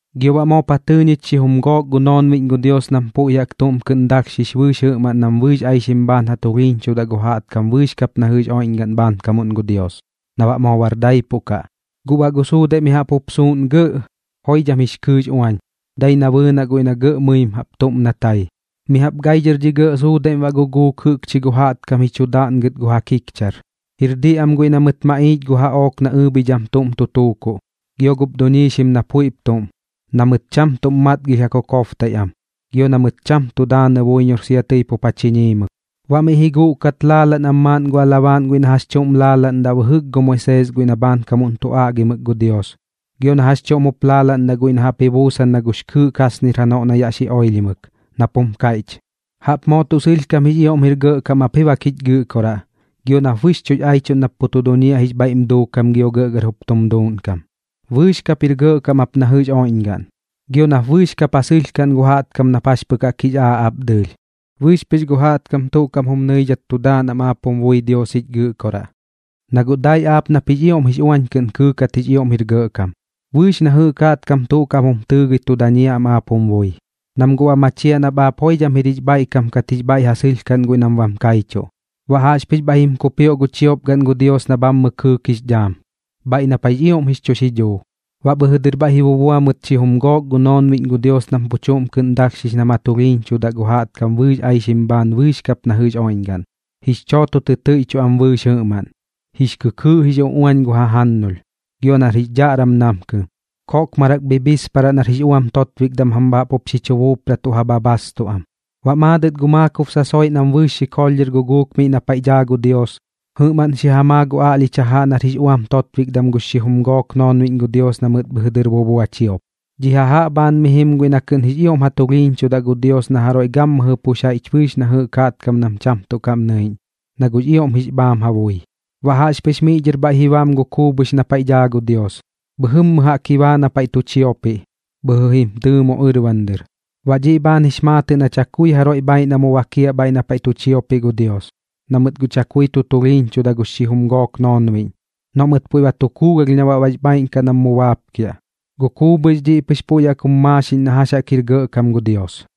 Gio baꞌ moop ja tɨɨ ñich xijum gook gu noonbiꞌñ gu Dios nam puiꞌ jaꞌk tuꞌm kɨꞌn dalhxix bɨɨx jɨꞌmaꞌn nam bɨɨx aixim bhaan ja tulhiiñchudaꞌ gu jaꞌtkam bɨɨx kap na jɨꞌx oiꞌñgaꞌn bhaankamuꞌn gu Dios, na baꞌ moo bar daipuꞌ kaꞌ. Guꞌ baꞌ gu suudaiꞌ mi jaꞌp jup suuꞌn gɇꞌ, joidham jix kɨɨꞌx uañ, dai na bɨɨnaꞌ guiꞌ na gɇꞌ mɨim jaꞌp na tai. Mi jaꞌp gai dhɨr dhi gɇꞌ suudaiꞌm baꞌ guguuk jɨꞌkchi gu jaꞌtkam ji chu daaꞌngɨt gu ja kikchar. Jir diꞌ am guiꞌ na mɨt maꞌiich gu jaꞌook nax ɨɨbhidham tuꞌm tu tuukuꞌ, gio gup duñiixim na puiꞌp tuꞌm, na mɨt cham tuꞌm matgilh ja kokobtaiꞌ am, gio na mɨt cham tu daanɨ buiñor sia tɨi pup ja chiñiimɨ. Baꞌ miꞌ ji guꞌkat laalaꞌn am maaꞌn gu alabaaꞌn guiꞌ na jax chuꞌm laalaꞌndaꞌ bɨjɨk gu Moisees guiꞌ na bhaankamuꞌn tu aꞌgimɨk gu Dios, gio na jax chuꞌm jup laalaꞌndaꞌ guiꞌ na jaꞌp ji buusan na gux kɨɨꞌ kasnir janoꞌ na yaꞌ xi oilhimɨk, nap jum kaiꞌch: ¡Jaꞌp moo tuꞌ sɨlhkam jix ioꞌm jir gɇꞌkam ap ji bak jich Gɨꞌkoraꞌ, gio nap bɨxchuꞌx aichuꞌn nap pu tu duñiaꞌ jix bhaiꞌm duukam gio gɇꞌgɇr jup jum duuꞌnkam! Bɨɨx kap jir gɇꞌkam ap na jɨꞌx oiꞌñgaꞌn, gio nap bɨɨx kap ja sɨlhkaꞌn gu jaꞌtkam nap jax pɨx jix aaꞌ aap dɨɨlh. Bɨɨx pɨx gu jaꞌtkam tuꞌ kaꞌm jum nɨidhat tu daan am aap jum bui Dios jich Gɨꞌkoraꞌ, na guꞌ dai aap nap jix ioꞌm jix uañ kɨꞌn kɨɨkat jix ioꞌm jir gɇꞌkam. Bɨɨx na jɨꞌk jaꞌtkam tuꞌ kaꞌm jum tɨɨgɨi tu dañiaꞌ am aap jum bui, nam guꞌ ba machiaꞌ nap aap joidham jir jix bhaiꞌkam kat jix bhaiꞌ ja sɨlhkaꞌn guiꞌ nam bam kaichuꞌ. Baꞌ jaꞌxpɨx bhaiꞌ jim kupioꞌ gu chiopgaꞌn gu Dios na bhammɨ kɨɨk jix dhaam, bhaiꞌ na paiꞌx ioꞌm jix chu xidhuu. Baꞌ bhɨjɨ dɨr bhaiꞌ ji bubua mɨt xijum gook gu noonbiꞌñ gu Dios nam pu chuꞌm kɨꞌn dalhxix nam ja tulhiiñchudaꞌ gu jaꞌtkam bɨɨx aixim bhaan bɨɨx kap na jɨꞌx oiꞌñgaꞌn. Jix chooto tɨ tɨiꞌchuꞌ am bɨɨx jɨꞌmaꞌn, jix kɨkɨɨꞌ ji guꞌx uꞌuañ gu ja jajannulh, gio nar jix dhaꞌram namkɨm, koꞌkmarak bhibhisparaꞌ nar jix uam totbikdam jam bha jaꞌp jup xi chu buupratuꞌ ja bhabhaastu am. Baꞌ maadɨt gu maakob sasoiꞌ nam bɨɨx xikoolh dhɨr guguuk miꞌ na paiꞌ daa gu Dios, jɨꞌmaꞌn xi ja maa gu aꞌlhich jajaꞌ nar jix uam totbikdam gux xijum gook noonbiꞌñ gu Dios na mɨt bhɨjɨ dɨr ji bubua chiop. Dhi jajaꞌ bhaan mi jim guiꞌ na tuꞌ kɨꞌn jix ioꞌm ja tulhiiñchudaꞌ gu Dios na jaroiꞌ gammɨjɨ pux jaiꞌch bɨɨx na jɨꞌk jaꞌtkam nam cham tuꞌ kaꞌm nɨiꞌñ, na guꞌx ioꞌm jix bhaam ja bui. Baꞌ jaꞌxpɨx miꞌ dhɨr bhaiꞌ ji bam gu kuubhɨx na paiꞌ daa gu Dios, bhɨjɨmmɨ jaꞌk ji baa na paiꞌ tu chiopiꞌ, bhɨjɨ jim tɨɨmo ɨrban dɨr. Baꞌ dhiꞌ bhaan jix maatɨꞌ na chakui jaroiꞌ bhaaiꞌ na mu bakiaꞌ na paiꞌ tu chiopiꞌ gu Dios, na mɨt guꞌ chakui tu tulhiiñchuda gux xijum gook noonbiꞌñ. Noꞌ mɨt puiꞌ ba tu kuugalh na baꞌ bax bhaaiꞌn kaꞌ nam mu baapkiaꞌ. Gu kuubhɨx dhiꞌ pɨx puiꞌ jaꞌk jum maaxiꞌñ na jax jaꞌk jir gɇꞌkam gu Dios.